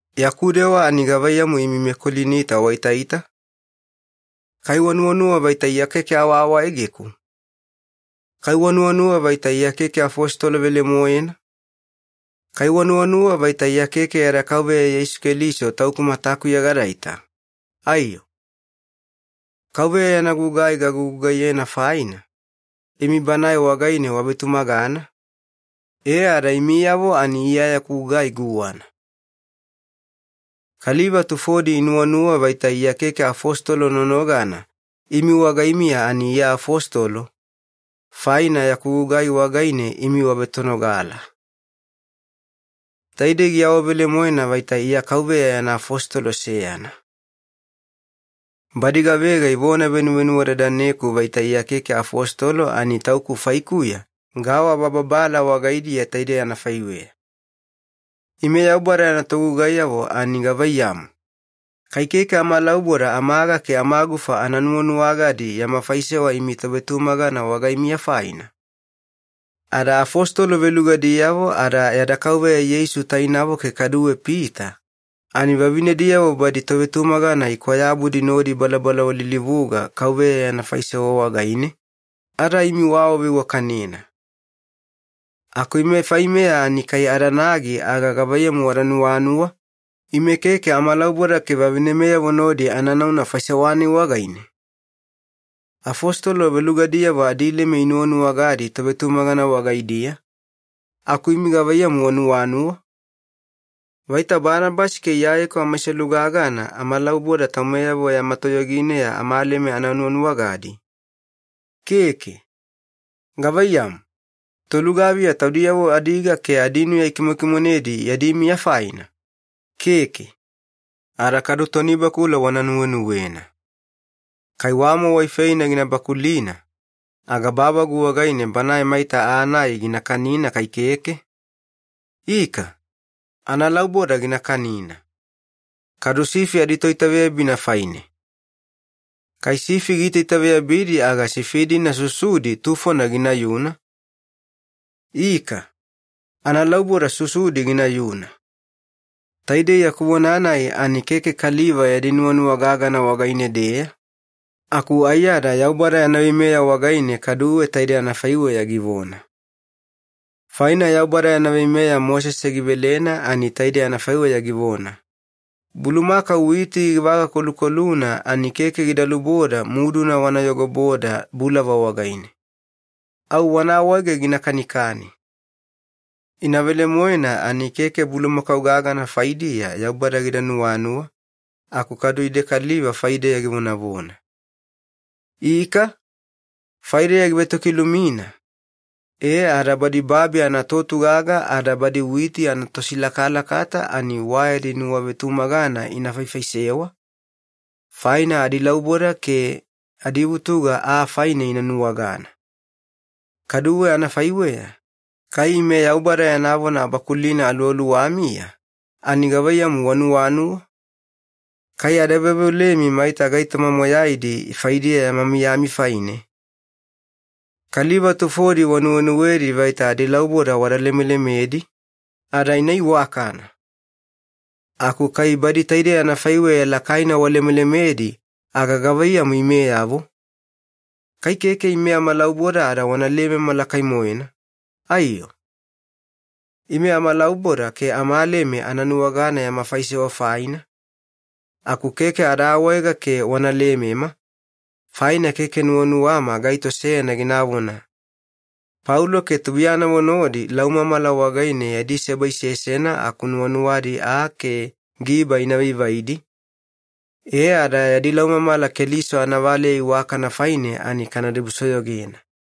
Yaku dewa ani gavaiyamu imi meKolinita waitaita? Kai wanuwanuwa vaita Iya keke awaawaegeku? Kai wanuwanuwa vaita Iya keke afositolo velemoena? Kai wanuwanuwa vaita Iya keke yada Kauveya Yeisu Keliso tauku matakuya gadaita, aiyo? Kauveya yana gugai gagugugaiyena faina, imi Banae wagaine wavetumagana, e ada imiyavo ani Iya yaku gugai guwana. Kaliva tufodi inuwanuwa vaita Iya keke afositolo nonogana imi wagaimiya ani Iya afositolo, faina yaku gugai wagaine imi wavetonogala. Taidei giawavelemoena vaita Iya Kauveya yana afositolo seyana. Badi gavega ivona venuvenuwadadaneku vaita Iya keke afositolo ani tauku faikuya gaawabababala wagaidiya taide anafaiweya. Ime Yaubada yana togugaiyavo ani gavaiyamu, kai keke amalauboda amaga ke amagufa ana nuwanuwagadi yama faisewa imi tovetumagana wagaimiya faina? Ada afositolo velugadiyavo ada yada Kauveya Yeisu tainavo ke kaduwe Pita, ani vavinediyavo badi tovetumagana ikwayabudi nodi ibalabala walilivuga Kauveya yana faisewa wagaine, ada imi waawaveiwakanena. Aku ime faimeya ani kai adanagi, aga gavaiyamu wada nuwanuwa, ime keke amalauboda ke vavinemeyavo nodi ana nauna faisewa-nai wagaine? Afositolo velugadiyavo adileme inuwanuwagadi tovetumagana wagaidiya, aku imi gavaiyamu wanuwanuwa? Vaita Banabasi ke Iyayeku amaiselu gagana amalauboda taumeyavo yama toyogineya amaleme ana nuwanuwagadi? Keke. Gavaiyamu, tolugaviya taudiyavo adiga ke adinuya ikimokimonedi yadi miya faina? Keke. Ada kadu tonibakula wana nuwenuwena. Kai wamo waifeina gina bakulina, aga bavagu wagaine banae maita aa-nai gina kanina kai keke? Ika, analauboda gina kanina. Kadu sifi aditoitaveyabina faine. Kai sifi giitaitaveyabidi aga sifi-dina susudi tufona ginayuna? Ika, analauboda susudi ginayuna. Taidei yaku vona-nai ani keke kaliva yadi nuwanuwa gagana wagaine-deya, aku aiyada Yaubada yana veimeya wagaine kaduwe taidei anafaiweya givona. Faina Yaubada yana veimeya Mosese givelena ani taidei anafaiweya givona, “Bulumakau witi givagakolukoluna ani keke gida luboda muduna wana yogoboda bulava wagaine. Au wana awaege gina kanikani.” Ina velemoena ani keke bulumakau gagana faidiya Yaubada gida nuwanuwa, aku kaduwe ide kaliva faideya givonavona. Ika, faideya givetokilumina, e ada badi babi anatotugaga ada badi witi anatosilakalakata ani wa yadi nuwavetumagana ina faifaisewa, faina adilauboda ke adivutuga aa faine ina nuwagana. Kaduwe anafaiweya, kai ime Yaubada yana vona abakulina aluwaluwamiya, ani gavaiyamu wanuwanuwa? Kai ada veoveolemi maita gaitoma moyaidi faidiya yama miyami faine? Kaliva tufodi wanuwenuwedi vaita adilauboda wada lemelemedi, ada ina iwakana. Aku kai badi taidei anafaiweya lakaina walemelemedi, aga gavaiyamu imeyavo? Kai keke ime amalauboda ada wana lemema lakai-moena, aiyo? Ime amalauboda ke amaleme ana nuwagana yama faisewa faina, aku keke ada awaega ke wana lemema, faina keke nuwanuwama gaito seyana ginavona, “Paulo ke tubuiyanavo nodi laumamala wagaine yadi seba isesena aku nuwanuwadi aa ke giba ina vaivaidi, e ada yadi laumamala Keliso anavaleya iwakana faine ani kana dibusoyogena.”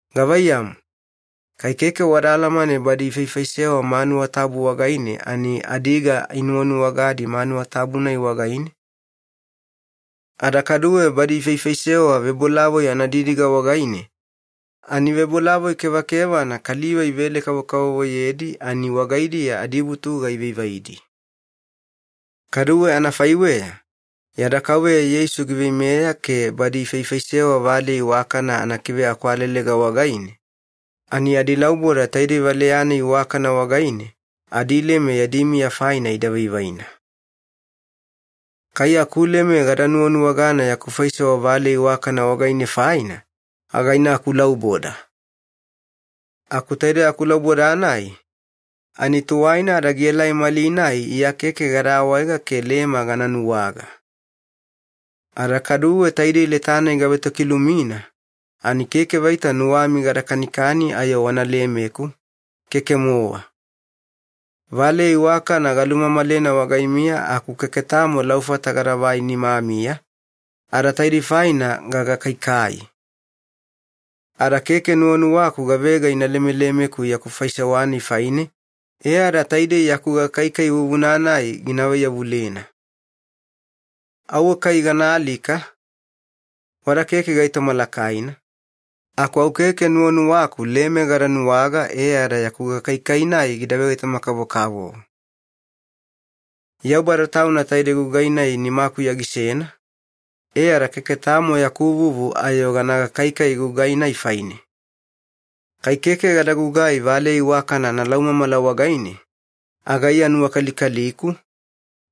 Gavaiyamu, kai keke wada alamane badi ifaifaisewa manuwa tabu wagaine, ani adiga inuwanuwagadi manuwa tabu-nai wagaine? Ada kaduwe badi ifaifaisewa vebolavoi anadidiga wagaine, ani vebolavoi kevakevana kaliva ivele-kavovoyedi ani wagaidiya adivutuga ivaivaidi. Kaduwe anafaiweya, yada Kauveya Yeisu giveimeya ke badi ifaifaisewa valeya iwakana anakive akwalelega wagaine, ani adilauboda taidei valeya-nai iwakana wagaine adileme yadi miya faina ida vaivaina. Kai akuleme gada nuwanuwagana yaku faisewa valeya iwakana wagaine faina, aga ina akulauboda. Aku taide akulauboda-nai, ani tuwaina ada gielai malinai Iya keke gada awaega ke leme gana nuwaga. Ada kaduwe taidei leta-nai gavetokilumina, ani keke vaita nuwami gada kanikani ayo wana lemeku, keke-mowa. Valeya iwakana galumamalena wagaimiya aku keke tamo laufata gadavai nimamiya, ada taidei faina gagakaikai. Ada keke nuwanuwaku gavega ina lemelemeku yaku faisewa-nai faine e ada taidei yaku gakaikai vuvuna-nai gina vaiyavulena. Auwe kai gana alika, wada keke gaitoma lakaina, aku au keke nuwanuwaku leme gada nuwaga e ada yaku gakaikai-nai gida vegaitoma-kavokavovo. Yaubada Tauna taidei gugai-nai nimakuya gisena, e ada keke tamo yaku vuvu ayo gana gakaikai gugai-nai faine. Kai keke gada gugai valeya iwakana analaumamala wagaine, aga Iya nuwakalikaliku,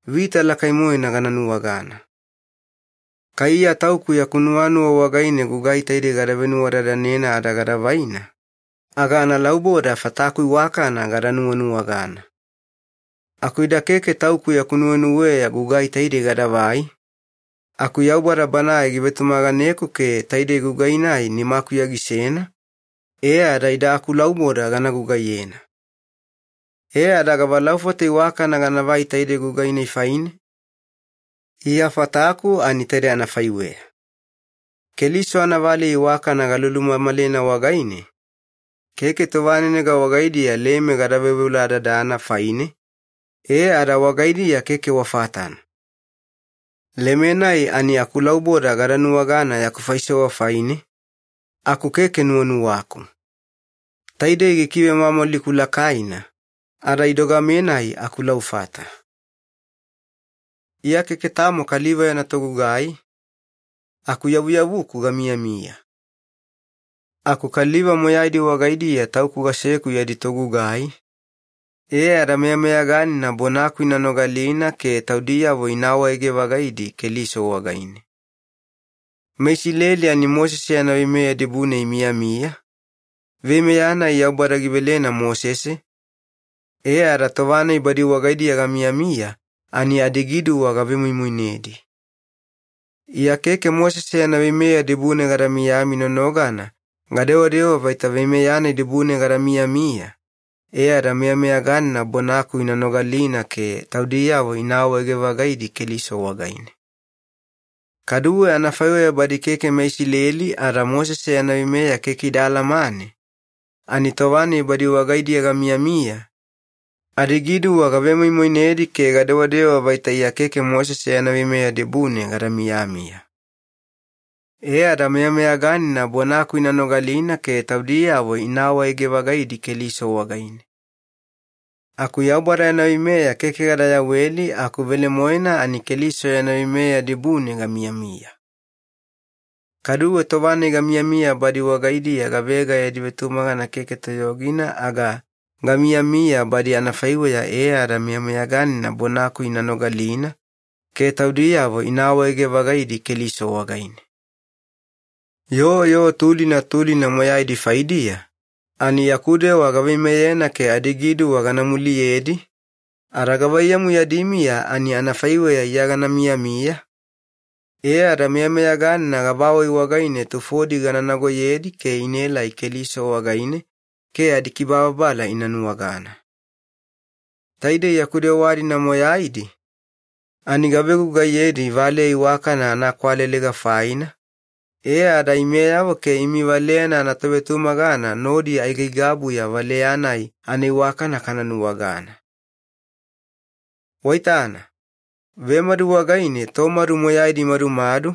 vita lakai-moena gana nuwagana. Kai Iya tauku yaku nuwanuwa wagaine gugai taidei gada venuwadadanena ada gada vaina, aga analauboda fataku iwakana gada nuwanuwagana. Aku ida keke tauku yaku nuwenuweya gugai taidei gadavai, aku Yaubada Banae givetumaganeku ke taidei gugai-nai nimakuya gisena, e ada ida akulauboda gana gugaiyena. E ada gavalaufata iwakana ganavai taidei gugai-nai faine? Iya fataku ani taide anafaiweya. Keliso anavaleya iwakana galulumamalena wagaine, keke tovanenega wagaidiya leme gada veoveoladadana faine, e ada wagaidiya keke wa fatana. Leme-nai ani akulauboda gada nuwagana yaku faisewa faine, aku keke nuwanuwaku. Taidei gikivemwamwaliku lakaina, ada idogame-nai akulaufata. Iya keke tamo kaliva yana togugai, aku yavuyavuku gamiyamiya. Aku kaliva moyaidi wagaidiya tauku gaseku yadi togugai, e ada meyameyaganina bonaku ina nogalina ke taudiyavo ina awaege-vagaidi Keliso wagaine. MeIsileli ani Mosese yana veimeya dibune imiyamiya, veimeya-nai Yaubada givelena Mosese, e ada tova-nai badi wagaidiya gamiyamiya ani adigiduwa gavemoimoinedi. Iya keke Mosese yana veimeya dibune gada miyami nonogana gadewadewa vaita veimeya-nai dibune gada miyamiya, e ada meyameyaganina bonaku ina nogalina ke taudiyavo ina awaege-vagaidi Keliso wagaine. Kaduwe anafaiweya badi keke meIsileli ada Mosese yana veimeya keke ida alamane, ani tova-nai badi wagaidiya gamiyamiya, adigiduwa gavemoimoinedi ke gadewadewa vaita Iya keke Mosese yana veimeya dibune gada miyamiya. E ada meyameyaganina bonaku ina nogalina ke taudiyavo ina awaege-vagaidi Keliso wagaine. Aku Yaubada yana veimeya keke gada yaweli, aku velemoena ani Keliso yana veimeya dibune gamiyamiya. Kaduwe tova-nai gamiyamiya badi wagaidiya gavega yadi vetumagana keke toyogina, aga gamiyamiya badi anafaiweya e ada meyameyaganina bonaku ina nogalina ke taudiyavo ina awaege-vagaidi Keliso wagaine. Yoo yoo tulina tulina moyaidi faidiya, ani yaku dewa gaveimeyena ke adigiduwa gana muliyedi, ada gavaiyamu yadi miya, ani anafaiweya Iya gana miyamiya, e ada meyameyaganina gavawai wagaine tufodi gana nagoyedi ke inaelai Keliso wagaine ke adikibababala ina nuwagana. Taidei yaku dewa-dina moyaidi, ani gavegugaiyedi valeya iwakana anaakwalelega faina, e ada imeyavo ke imi valeyana anatovetumagana nodi aigaigabuya valeya-nai anaiwakana kana nuwagana. Waitana, vemadu wagaine tomadu moyaidi imadumadu,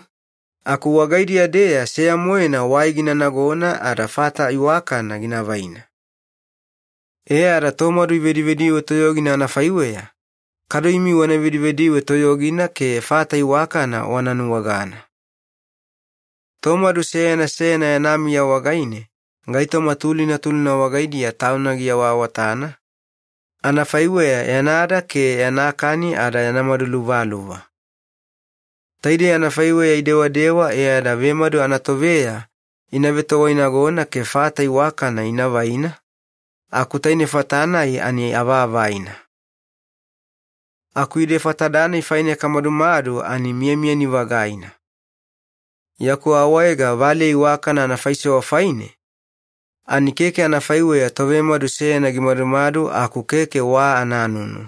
aku wagaidiya-deya seya-moena wai gina nagona ada fata iwakana gina vaina. E ada tomadu ivedivediwe toyogina anafaiweya, kadu imi wana vedivediwe toyogina ke fata iwakana wana nuwagana. Tomadu seyana seyana yana miya wagaine, gaitoma tulina tulina wagaidiya tauna giawaawatana, anafaiweya yanada ke yana kani ada yana madu luvaluva. Taidei anafaiweya idewadewa e ada vemadu anatoveya ina vetowainagona ke fata iwakana ina vaina, aku taine fata-nai ani avaavaina. Aku ide fatada-nai faine kamadumadu ani miyamiyani-vagaina. Yaku awaega valeya iwakana anafaisewa faine, ani keke anafaiweya tovemadu seyana gimadumadu aku keke wa ananunu.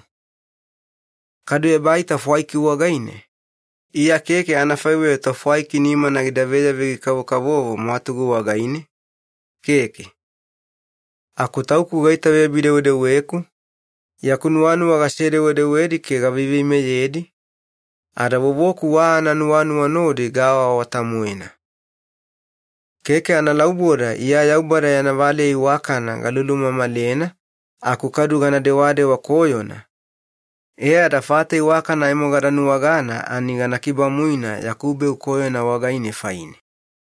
Kadu ebaita fwaiki wagaine, Iya keke anafaiweya tofwaiki nimana gida veyavegi-kavokavovo mwatugu wagaine, keke. Aku tauku gaitaveyabi-dewedeweku, yaku nuwanuwa gasedewedewedi ke gaveiveimeyedi, ada vovoku wa ananuwanuwa nodi gaawaawata-moena. Keke analauboda Iya Yaubada yana valeya iwakana galulumamalena aku kadu gana dewadewa koyona, e ada fata iwakana aimo gada nuwagana ani gana kibamuina yaku beu koyona wagaine faine.